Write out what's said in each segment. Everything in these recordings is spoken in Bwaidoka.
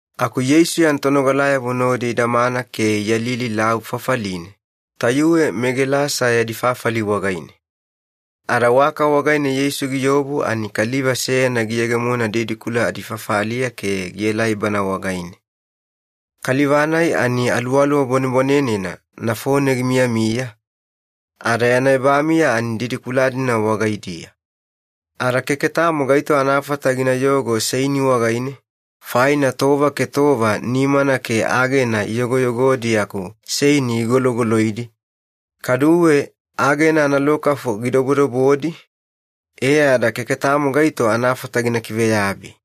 Aku Yeisu yana tonogalayavo nodi idamana ke iyalili lavu fafaline, tayuwe meGelasa yadi fafali wagaine. Ada waka wagaine Yeisu giobu ani kaliva seyana giyegemona didikula adifafaliya ke gielai Bana wagaine. Kaliva-nai ani aluwaluwa bwanebwanenena nafone gimiyamiya, ada yana ebamiya ani didikula-dina wagaidiya. Ada keke tamo gaito anafata ginayogo seini wagaine, faina tova ke tova nimana ke agena iyogoyogodi aku seini gigologoloidi, kaduwe agena analokafu gidobodobodi, e ada keke tamo gaito anafata gina kiveyabi.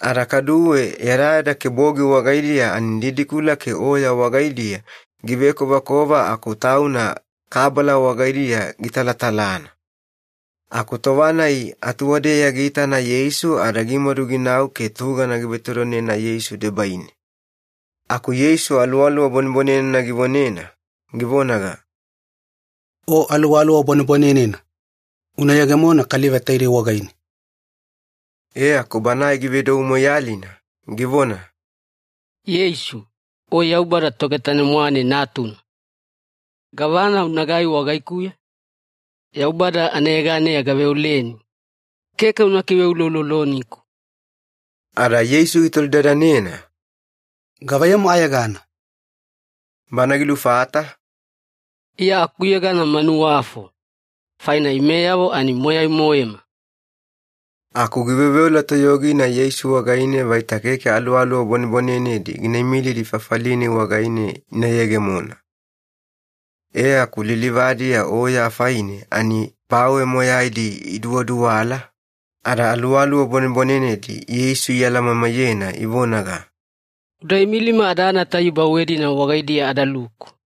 Ada kaduwe yadayada ke bogi wagaidiya ani didikula ke oya wagaidiya givekovakova aku tauna kabala wagaidiya gitalatalana. Aku tova-nai atuwadeya giitana Yeisu ada gimadu ginau ke tugana givetodonena Yeisu debaine. Aku Yeisu aluwaluwa bwanenena givonena, givonaga, “O aluwaluwa bwanebwanenena, una yegemona kaliva taidei wagaine!” E aku banae givedou moiyalina, givona, “Yeisu, O Yaubada Togetanemwane Natuna! Gavana unagai wagaikuya? Yaubada anayeganeya gaveoleni, keke una kiveulouloniku!” Ada Yeisu gitolidadanena, “Gavaiyamu ayegana?” Bana gilufata, “Iya akuyegana Manuwafo, faina imeyavo ani moyai-moema.” Aku giveoveola toyogina Yeisu wagaine vaita keke aluwaluwa bwanebwanenedi gina imilidi fafali-nai wagaine ina yegemona. E aku lilivadiya oya afaine ani bawe moyaidi iduwaduwala, ada aluwaluwa bwanebwanenedi Yeisu ialamamaiyena, ivonaga, “Uda imilima adana tayuwe bawe-dina wagaidiya adaluku!”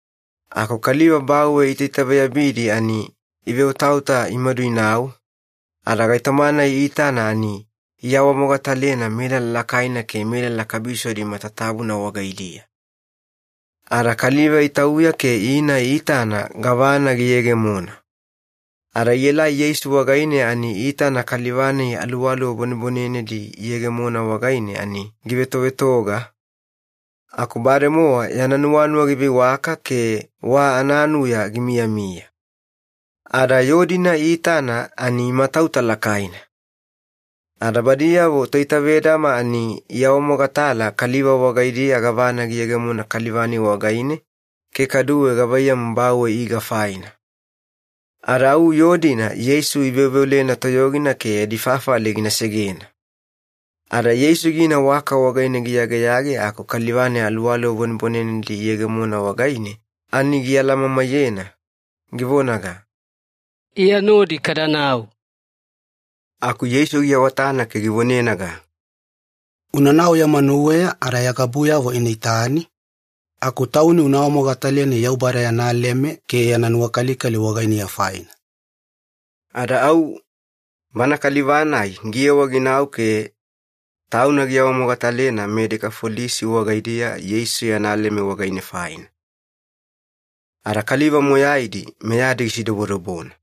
Aku kaliva bawe iitaitaveyabidi ani iveotaota imadu inau, ada gaitoma-nai iitana ani iawamogatalena melala lakaina ke melala kabisodi matatabuna wagaidiya. Ada kaliva itauya ke ina itana gavana giyegemona. Ada ielai Yeisu wagaine ani iitana kaliva-nai aluwaluwa bwanebwanenedi iyegemona wagaine ani givetovetoga, aku bademowa yana nuwanuwa giveiwaka ke wa ananuya gimiyamiya. Ada yoo-dina iitana ani imatauta lakaina. Ada badiyavo toitavedama ani iawamogatala kaliva wagaidiya gavana giyegemona kaliva-nai wagaine ke kaduwe gavaiyamu bawe iga faina. Ada au yoo-dina Yeisu iveoveolena toyogina ke yadi fafali gina segena. Ada Yeisu gina waka wagaine giyageyage aku kaliva-nai aluwaluwa bwanebwanenedi iyegemona wagaine ani gialamamaiyena, givonaga, “Iya nodi kadanau!” Aku Yeisu giawatana ke givonenaga, “Unanau ya manuweya ada ya gabuyavo ina itani, aku tauni una awamogataleni Yaubada yana leme ke yana nuwakalikali wagainiya faina.” Ada au, bana kaliva-nai giyewa ginau ke tauna giawamogatalena meDekafolisi wagaidiya Yeisu yana leme wagaine faina. Ada kaliva moyaidi meyadi gisidobodobona.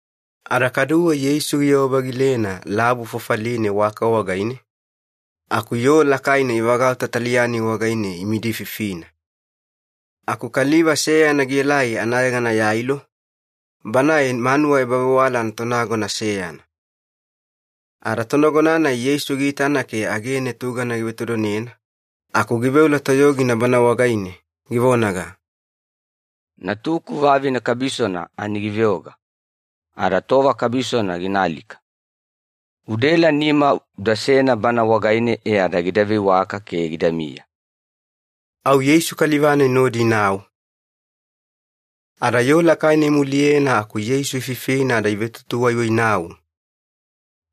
Ada kaduwe Yeisu giyewa-vagilena lavu fafaline waka wagaine, aku yoo lakaina ivagauta taliya-nai wagaine imidififina. Aku kaliva seyana gielai anayegana Yailo, banae manuwa ebavewala anatonagona seyana. Ada tonagona-nai Yeisu giitana ke agene tugana givetodonena aku giveola toyogina Bana wagaine, givonaga, “Natuku vavine kabisona ani giveoga, ada tova kabisona gina alika. Udaela nima udasena bana wagaine e ada gida veiwaka ke gidamiya.” Au Yeisu kaliva-nai nodi inau. Ada yoo lakaina imuliyena aku Yeisu ififina ada ivetutuwaiwainau.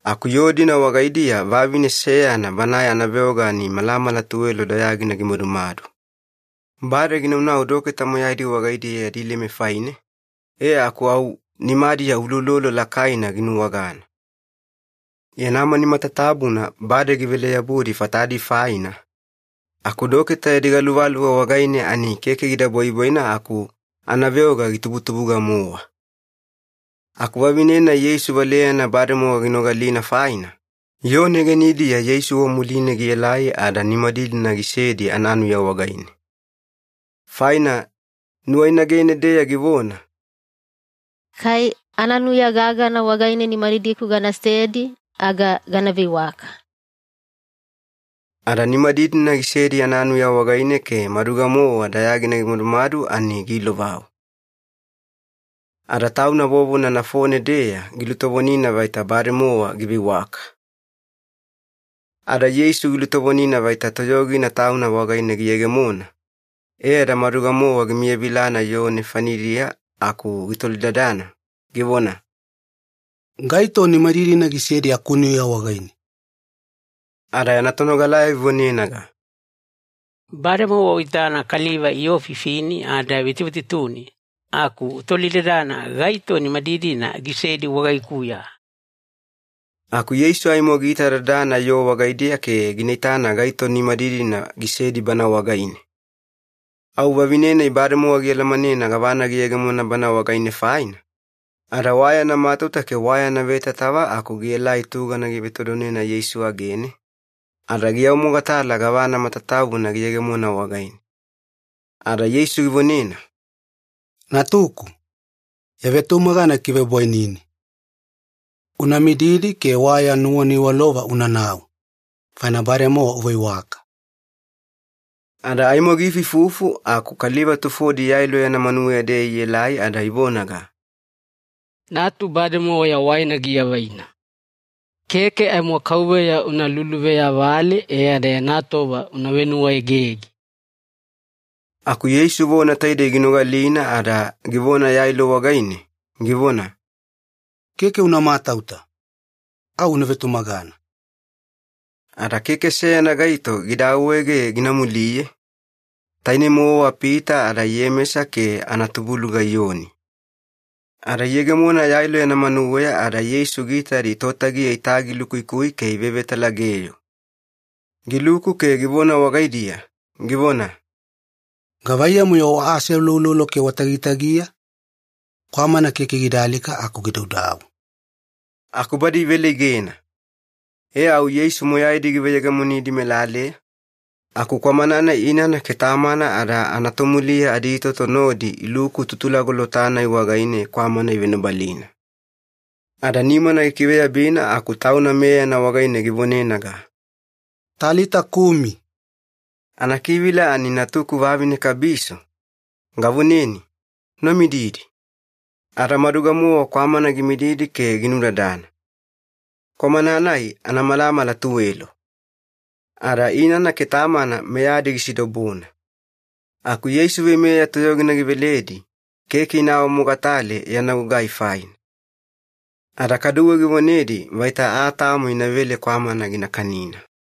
Aku yoo-dina wagaidiya vavine seyana banae anaveoga ani malamala tuwelo dayagina gimadumadu. Bade ginaunau doketa moyaidi wagaidiya yadi leme faine, e aku au nimadiya uloulolo lakaina ginuwagana. Yana mani matatabuna bade givele-yabudi fatadi faina, aku doketa yadi galuvaluva wagaine ani keke gida bwaibwaina aku anaveoga gitubutubuga-mowa. Aku vavine-nai Yeisu valeyana bademowa ginogalina faina, yoo negenidiya Yeisu wamuline gielai ada nimadidina gisedi ananuya wagaine. Faina nuwainagene-deya givona, “Kai ananuya gagana wagaine nimadidiku ganasedi, aga gana veiwaka.” Ada nimadidina gisedi ananuya wagaine, ke maduga-mowa dayagina gimadumadu ani giilovau. Ada tauna vovona nafone-deya gilutovonina vaita bademowa giveiwaka. Ada Yeisu gilutovonina vaita toyogina Tauna wagaine giyegemona, e ada maduga-mowa gimiyavilana yoo nefanidiya aku gitolidadana, givona, “Gaito nimadidina gisedi akunuya wagaine?” Ada yana tonogalayavo ivonenaga, “Bademowa uitana kaliva iyoofifini ada ivetuvetutuni, aku utolidadana ‘Gaito nimadidina gisedi wagaikuya?’” Aku Yeisu aimo giitadadana yoo wagaidiya ke gina itana gaito nimadidina gisedi bana wagaine. Au vavine-nai bademowa gialamanena gavana giyegemona bana wagaine faina, ada wa yana matauta ke wa yana vetatava aku gielai tugana givetodonena Yeisu agene, ada giawamogatala gavana matatabuna giyegemona wagaine. Ada Yeisu givonena, “Natuku, ya vetumagana gikivebwainini. Una mididi ke wa ya nuwaniwalova unanau, faina bademowa uveiwaka.” Ada aimo giifuifufu aku kaliva tufodi Yailo yana manuweya-deya ielai ada ivonaga, “Natu bademowa yawaina giavaina. Keke aimo Kauveya una luluveyavale e ada yana tova una venuwaegege.” Aku Yeisu vona taidei ginogalina ada givona Yailo wagaine, givona, “Keke una matauta, au una vetumagana.” Ada keke seyana gaito gida awaege gina muliye, tainei-mowa Pita ada Iyemesa ke anatubuluga Iyoni. Ada iyegemona Yailo yana manuweya ada Yeisu giitadi totagiya itagilukuikui ke ivevetalageyo. Giluku ke givona wagaidiya, givona, “Gavaiyamu-yo waaseuloulolo ke watagitagiya? Kwamana keke gida alika aku gidaudau.” Aku badi iveleigena. E au Yeisu moyaidi giveyegemonidi melaleya, aku kwamana-nai inana ke tamana ada anatomuliya aditoto nodi iluku tutulagolota-nai wagaine kwamana ivenobalina. Ada nimana gikiveyabina aku Tauna meyana wagaine givonenaga, “Talita kumi!” Anakivila ani “Natuku vavine kabiso, gavoneni, una mididi!” Ada maduga-mowa kwamana gimididi ke ginudadana. Kwamana-nai anamalamala tuwelo. Ada inana ke tamana meyadi gisidobona. Aku Yeisu veimeya toyogina giveledi, keke ina awamogatale yana gugai faina. Ada kaduwe givonedi vaita aa tamo inavele kwamana gina kanina.